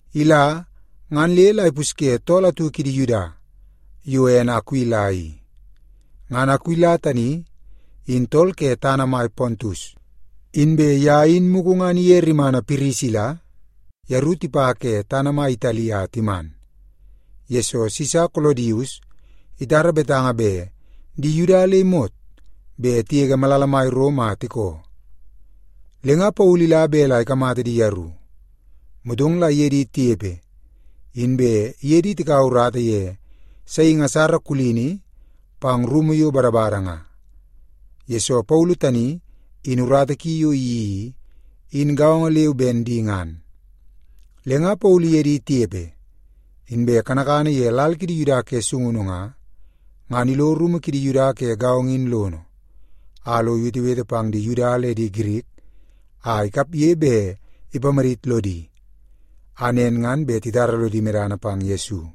Ila, ngan le la ipusye tool atu kidi Yuda yo ene Akuila i. Ngan Akuila tani in tool ke tana mai Pontus, inbe ye in mugu ngan iye rimana Pirisila yeru tipa ke tana mai Itali a timan, yesoo Sisa Kolodius itara betanga bet di Yuda le imot bet tigege malala mai Rom a tikoo. Le nga Paulu ila bet la ikamata di yeru. Motong la iye di tinepe, inbe iye di tikaua urata ye saingi asara kulini pang rumu yo badabada nga, yesoo Paulu tani in urata ki yo iyeii i, in gaongo leu ben di ngan. Le nga Paulu iye di tinepe, inbe kanakana ye lal kidi Yuda ke sungunu nga, ngan ilo rumu kidi Yuda ke gaongo in lono, a lo iwetewete pang di Yuda le Girik a ikapge bet ipamadit lodi, a nen ngan bet titara lodi medana pang Yesu.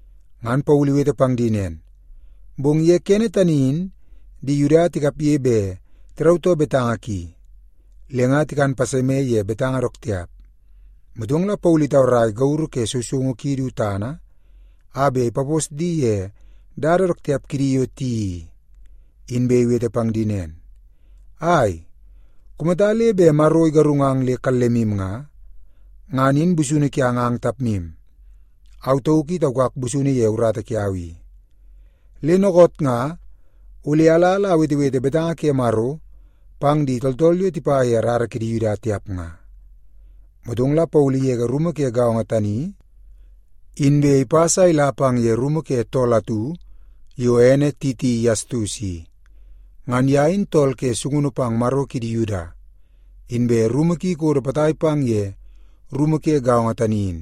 Ngan Paulu iwete pang di nen, bong ye kene tani in di Yuda tikapge bet tirautoo betanga ki, le nga tikan paseme ye betanga dook tiap. Motong la Paulu itaurai gauru ye sousoungu ki du tana a bet ipapos di ye dada dook tiap kidi yo tiyeii i, inbe iwete pang di nen, “Ai, kumata le bet Maro igarungang le kallemu nga, ngan in busunu kiang ang tapmu. Au tauk i taukak busunu ye urata kiau i. Le dookoot nga ole ala la awetewete betanga ke Maro pang di tooltool yo tipa ye rara kidi Yuda tiap nga.” Motong la Paulu igege rumu ke gaongo tani, inbe ipas a ila pang ye rumu ke tool atu yo ene Titi Yastus i. Ngan ye in tool ke sungunu pang Maro kidi Yuda, inbe rumu ki ikodo potai pang ye rumu ke gaongo tani in.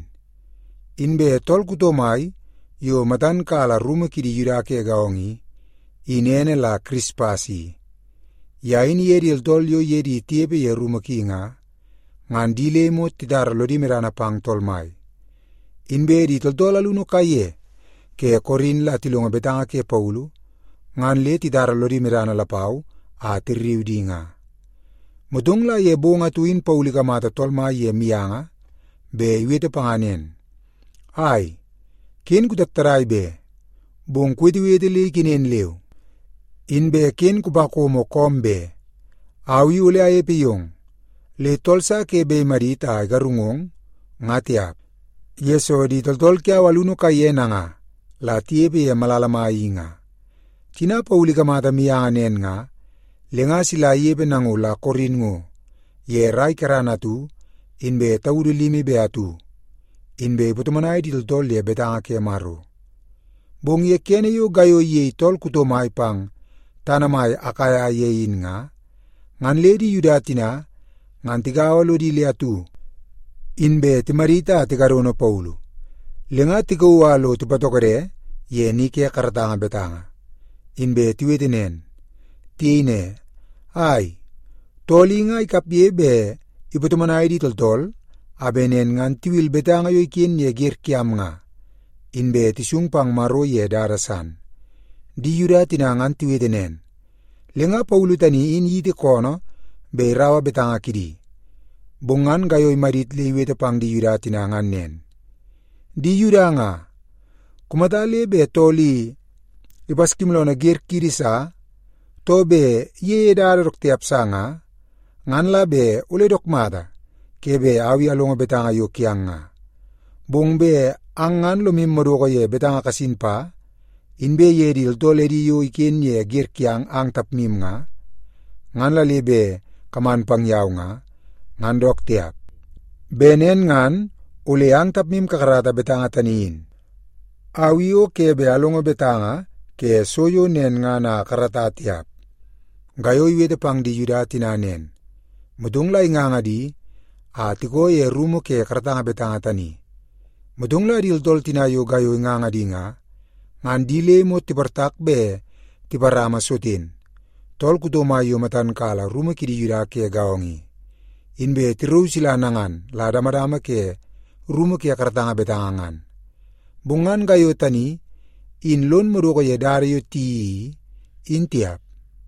Inbe tool kuto mai yo matan kala rumu kidi Yuda ke gaongo i, in ene la Kirispas i. Ye in iye di tooltool yo iye di tinepe ye rumu ki nga, ngan di le imot titara lodi medana pang Tool Mai. Inbe di tooltool alunu kaiye ke Korin la tilongo betanga ke Paulu, ngan le titara lodi medana lapau a tirriu di nga. Motong la ye bong atu in Paulu ikamata Tool Mai ye mianga bet iwete panga nen, “Ai, ken kutattadai be! Bong kuwetewete le ikenen leu, inbe ken kupakomo koom be. Au i ole anepe yong, le tool sa ke bet imadit a igarungong, nga tiap, yesoo di tooltool kiau alunu kaiye nanga la tinepe ye malala mai i nga.” Tina Paulu ikamata mianga nen nga, le nga sila inepe nango la Korin ngo ye rai kerana atu inbe taudu limi be atu, inbe ipatomonai di tooltool ye betanga ke Maro. Bong ye kene yo Gaiyo iyei tool kuto mai pang tana mai Akaia ye in nga, ngan le di Yuda tina ngan tigaua lodi le atu, inbe timadit a tikadono Paulu. Le nga tikauu a lo tipatokode ye ni ke karatanga betanga, inbe tiwete nen. Tiyei ne, “Ai, tool i nga ikapge bet ipatomonai di tooltool, a bet nen ngan tiwil betanga yo iken ye wer kiam nga, inbe tisung pang Maro ye dada san.” Di Yuda tina ngan tiwete nen, le nga Paulu tani in iyiti koonoo bet iraua betanga kidi. Bong ngan Gaiyo imadit le iwete pang di Yuda tina ngan nen, “Di Yuda nga, kumata le bet tool i ipaskimooloonoo wer kiidi sa, too bet iyeie dada dook tiap sa nga, ngan la bet ole dook mata ke bet au i alongo betanga yo kiang nga. Bong bet ang ngan lomu madoko ye betanga kasin pa, inbe ye di tooltool edi yo iken ye wer kiang ang tapmu nga, ngan la le bet kaman pang yau nga, ngan dook tiap. Bet nen ngan ole ang tapmu kakarata betanga tani in. Au i o ke bet alongo betanga ke so yo nen ngan a akarata tiap.” Gaiyo iwete pang di Yuda tina nen, motong la inganga di a tikoo ye rumu ke karatanga betanga tani. Motong la di tooltool tina yo Gaiyo inganga di nga, ngan di le imot tiportak bet tiparama Soten, tool kuto mai yo matan kala rumu kidi Yuda ke gaongo i, inbe tirauu sila nangan la damadama ke rumu ke karatanga betanga ngan. Bong ngan Gaiyo tani in lon madoko ye dada yo tiyeii i, in tiap.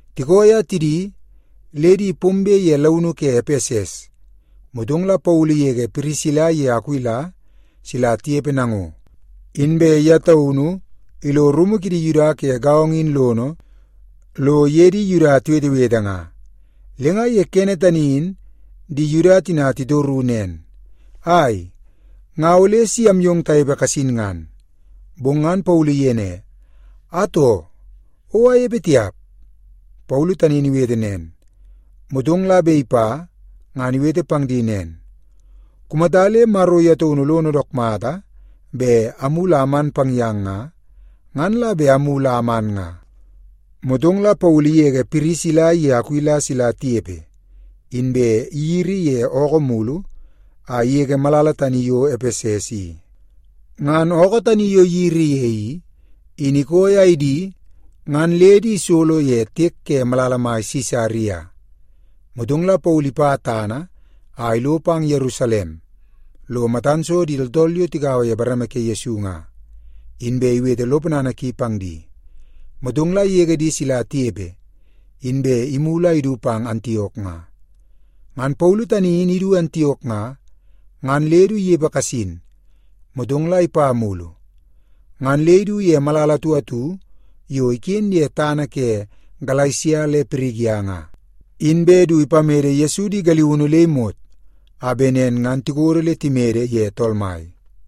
Tikooi a tidi, le di pombe ye launu ke Epeses, motong la Paulu igege Pirisila iye Akuila sila tinepe nango, inbe ye taunu ilo rumu kidi Yuda ke gaongo in lono lo iye di Yuda tiwetewete nga. Le nga ye kene tani in di Yuda tina titoru nen, “Ai, nga ole si amyong tanepe kasin ngan.” Bong ngan Paulu iyei ne, “Atoo, o anepe tiap.” Paulu tani in iwete nen, motong la bet ipa, ngan iwete pang di nen, “Kumata le Maro ye taunu lono dook mata bet amulu a aman pang yang nga, ngan la bet amulu a aman nga.” Motong la Paulu igege Pirisila iye Akuila sila tinepe, inbe iyiri ye ookoo mulu a igege malala tani yo Epeses i. Ngan ookoo tani yo iyiri ye i, in ikooi a idi ngan le di isolo ye tiek ke malala mai Sisaria. Motong la Paulu ipa tana a ilo pang Yerusalem lo matan so di tooltool yo tigaua ye bareme ke Yesu nga, inbe iwete lo ponana ki pang di. Motong la igege di sila tinepe, inbe imulu a idu pang Antiok nga. Ngan Paulu tani in idu Antiok nga, ngan le du inepe kasin, motong la ipa mulu. Ngan le idu ye malala atu atu yo iken ye tana ke Galesia le Pirigia nga, inbe du ipamede Yesu di galiunu le imot a bet nen ngan tikodo le timede ye Tool Mai.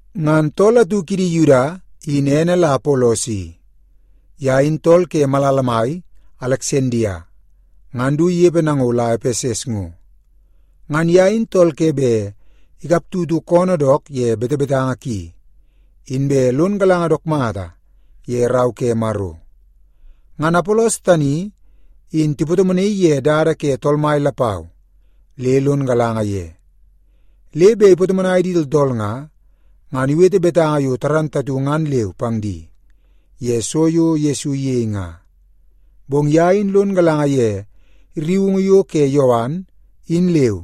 Ngan tool atu kidi Yuda in ene la Apolos i. Ye in tool ke malala mai Aleksandia ngan du inepe nango la Epeses ngo. Ngan ye in tool ke bet ikap tutu koonoo dook ye betebetanga ki, inbe lon galanga dook mata ye Rau ke Maro. Ngan Apolos tani in tipatomonaii ye dada ke Tool Mai lapau le lon galanga ye. Le bet ipatomonai di tooltool nga, ngan iwete betanga yo moolmool ngan leu pang di ye so yo Yesu iyei nga. Bong ye in lon galanga ye rriungu yo ke Yowan, in leu.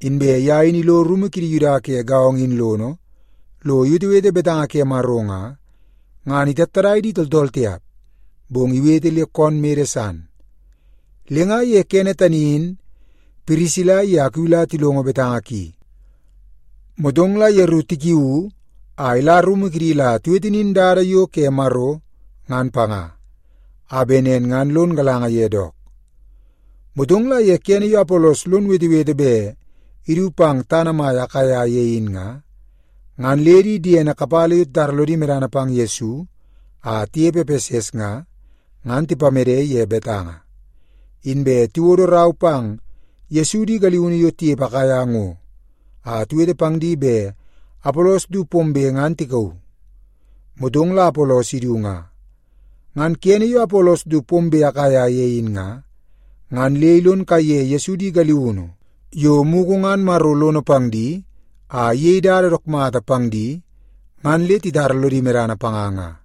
Inbe ye in ilo rumu kidi Yuda ke gaongo in lono, lo iwetewete betanga ke Maro nga, ngan itattadai di tooltool tiap, bong iwete le koon mede san. Le nga ye kene tani in Pirisila iye Akuila tilongo betanga ki, motong la yeru tikiuu a ila rumu kidi la tiwete nin dada yo ke Maro ngan panga, a bet nen ngan lon galanga ye dook. Motong la ye kene yo Apolos lon wetewete bet idu pang tana mai Akaia ye in nga, ngan le di diene kapala yo titara lodi medana pang Yesu a tinepe Epeses nga, ngan tipamede ye betanga. Inbe tiwodo rau pang Yesu di galiunu yo tinepe Akaia ngo a tiwete pang di bet Apolos du pombe ngan tikauu. Motong la Apolos idu nga. Ngan kene yo Apolos du pombe Akaia ye in nga, ngan le ilon kaiye Yesu di galiunu yo mugu ngan Maro lono pang di a iyei dada dook mata pang di ngan le titara lodi medana panga nga.